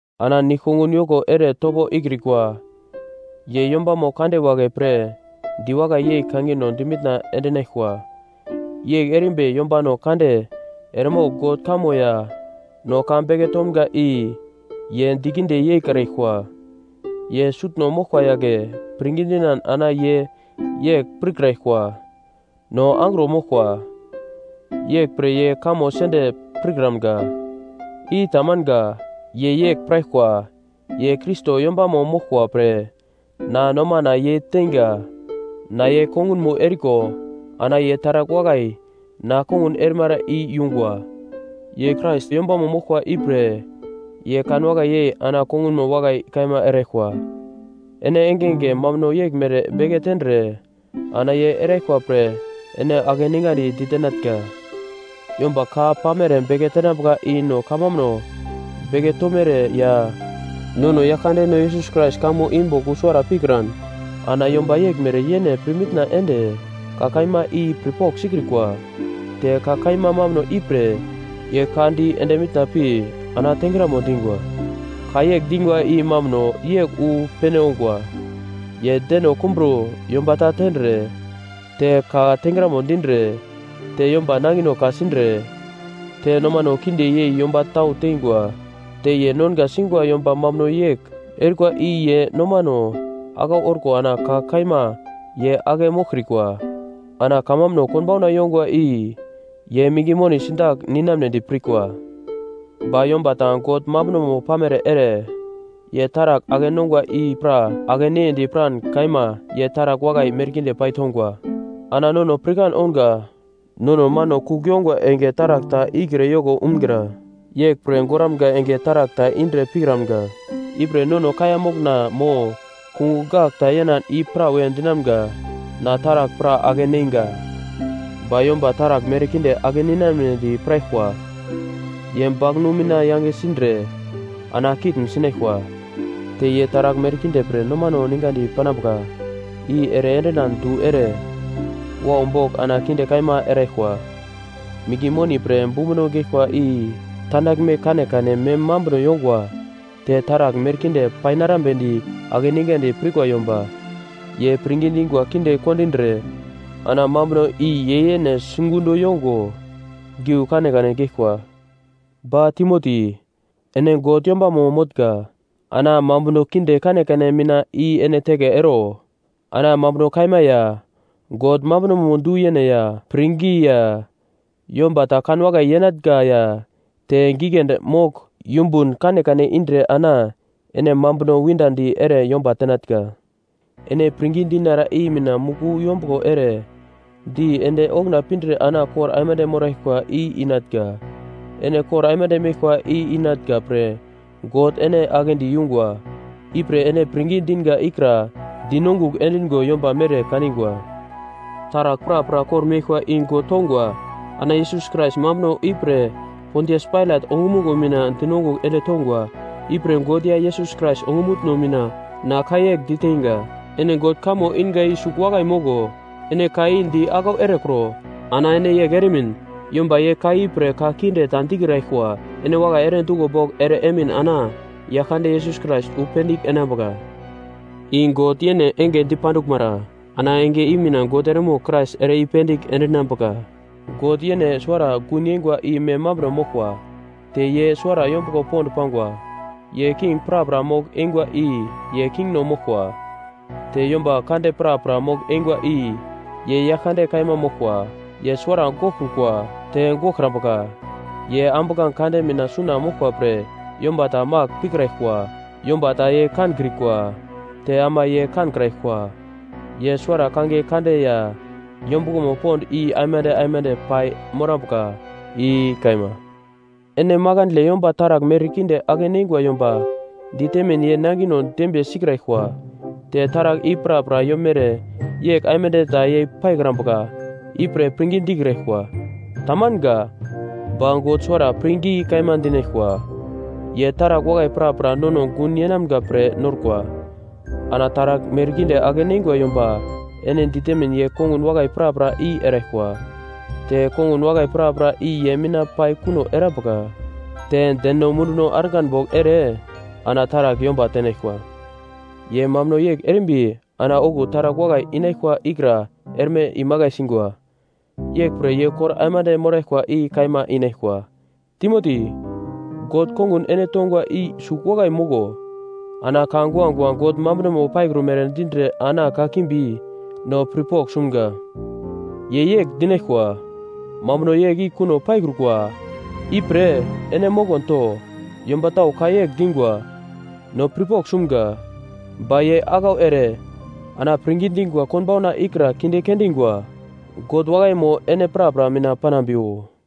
Ana nigl-kongun yoko ere topo ikrikwa ye yombamo kande wagle pre diwakai yei kangino dimitna endinaglkwa. Yegl erimbi yombano kande eremogl God kamo ya no ka beke tomga i ye dikinde yeikraglkwa. Ye sutno moglkwa yagle pirngi dinan ana ye yegl pirkraglkwa, “No angro moglkwa, yeglpre ye kamo sende pirkramga.” I tamanga. Ye yegl piraglkwa, “Ye Krais yombamo moglkwa pre na nomana ye teinga. Na ye kongunmo eriko ana ye taragl wakai na kongun erimara i yungwa.” Ye Krais yombamo moglkwa ipre ye kanwakai yei ana kongunmo wakai kaima eraglkwa. Ene engenge mambuno yeglmere beke tendre ana ye eraglkwa pre ene akeningandi ditenatnga. Yomba ka pamere beke tenambuka i no kamambuno beke tomere ya nono Yaglkandeno Yesus Krais kamo i bogl wu suwara pikran, ana yomba yeglmere yene pirmitna ende ka kaima i pirpogl sikrikwa. Te ka kaima mambuno ipre ye ka di ende mitna pi ana tengramo dingwa. Ka yegl dingwa i mambuno yegl wu pene ongwa: Ye deno kumbro yomba ta tendre, te ka tengramo dindre, te yomba nangino ka-sindre, te nomano kinde yei yomba tau teingwa, te ye nonga singwa yomba mambuno yegl erikwa i ye nomano aglau orko ana ka kaima ye ake moglkrikwa. Ana kamambuno konbauna yongwa i ye minge moni sindagl ninamnedi pirkwa Ba yomba ta God mambunomo pamere ere ye taragl ake-nongwa i pra ake-neyedi piran kaima ye taragl wakai merkinde paitongwa. Ana nono pirkan ounga, nono mano kugl yongwa enge taragl ta ikre yoko umgra, yeglpre goramga enge taragl ta indre pikramga. Ipre nono kaiya mokna mo kungugl gagl ta yenan i prawe dinamga, “Na taragl pra ake-neinga.” Ba yomba taragl merkinde ake ninamedi piraglkwa ye baglnu mina yange sindre ana kitn sinaglkwa. Te ye taragl merkinde pre nomano ningadi panambuka i ere endinan du ere, wau bogl ana kinde kaima eraglkwa. Minge moni pre bumbuno geglkwa i tandaglme kanekane mem mambuno yongwa. Te taragl merkinde painarambedi akeningandi pirkwa yomba ye pirngi dingwa kinde kondindre ana mambuno i ye yene sigundo yongo giu kanekane geglkwa. Ba Timoti, ene God yombamo motnga, ana mambuno kinde kanekane mina i ene teke ero. Ana mambuno kaima ya, God mambunomo du-yene ya pirngi ya yomba ta kanwakai yenatnga ya te giglendi mogl yumbun kanekane indre ana ene mambuno windadi ere yomba tenatnga. Ene pirngi dinara i mina muku yombuglo ere di ende okuna pindre ana kor aimande moraglkwa i inatnga. Ene kor aimande meglkwa i inatnga pre God ene aglendi yungwa. Ipre ene pirngi dinga ikra dinongugl endingo yomba mere kaningwa Taragl prapra kor-meglkwa i God tongwa. Ana Yesus Krais mambuno ipre Pontias Pailat ongumuglo mina dinongugl ende tongwa. Ipre God ya Yesus Krais ongumutno mina na ka yegl diteinga. Ene God kamo inga i sugl wakai moglo. Ene ka i di aglau erekro. Ana ene yegl eremin, yomba ye ka ipre ka kinde ta dikraglkwa. Ene wakai ere duglo bogl ere emin ana Yaglkande Yesus Krais wu pendigl enambuka, i God yene enge dipanduglmara, ana enge i mina God eremogl Krais ere i-pendigl endinambuka. God yene suwara gun yeingwa i mem mambuno moglkwa, te ye suwara yombuglo pond pangwa. Ye king prapra mogl-eingwa i ye kingno moglkwa. Te yomba kande prapra mogl-eingwa i ye Yaglkande Kaima moglkwa. Ye suwara goglkrukwa, te goglkrambuka. Ye ambuglange kande mina suna moglkwa pre yomba ta magl pikraglkwa. Yomba ta ye kankrikwa, te ama ye kankraglkwa. Ye suwara kangiye kande ya yombuglomo pond i aimande aimande pai morambuka. I kaima. Ene makandle yomba taragl merkinde ake-neingwa yomba ditemin ye nangino dembiye sikraglkwa. Te taragl i prapra yomere yegl aimande ta yei paikrambuka ipre pirngi dikraglkwa. Tamanga. Ba God suwara pirngi kaima dinaglkwa, ye taragl wakai prapra nono gun yenamga pre norkwa. Ana taragl merkinde ake-neingwa yomba ene ditemin ye kongun wakai prapra i eraglkwa, te kongun wakai prapra i ye mina pai kuno erambuka, te deno munduno argan bogl ere ana taragl yomba tenaglkwa. Ye mambuno yegl erimbi ana okuwo taragl wakai inaglkwa ikra erme imakai singwa. Yeglpre ye kor aimande moraglkwa i kaima inaglkwa. Timoti, God kongun ene tongwa i sugl wakai moglo. Ana ka guagua God mambunomo paikrumere dindre ana kakimbi, ‘no pirpogl sumga’ ye yegl dinaglkwa, mambuno yegl i kuno paikrukwa, ipre ene mokon to. Yomba tau ka yegl dingwa, “No pirpogl sumga.” Ba ye aglau ere ana pirngi dingwa konbauna ikra kinde kendingwa. God wakaimo ene prapra mina panambiwo.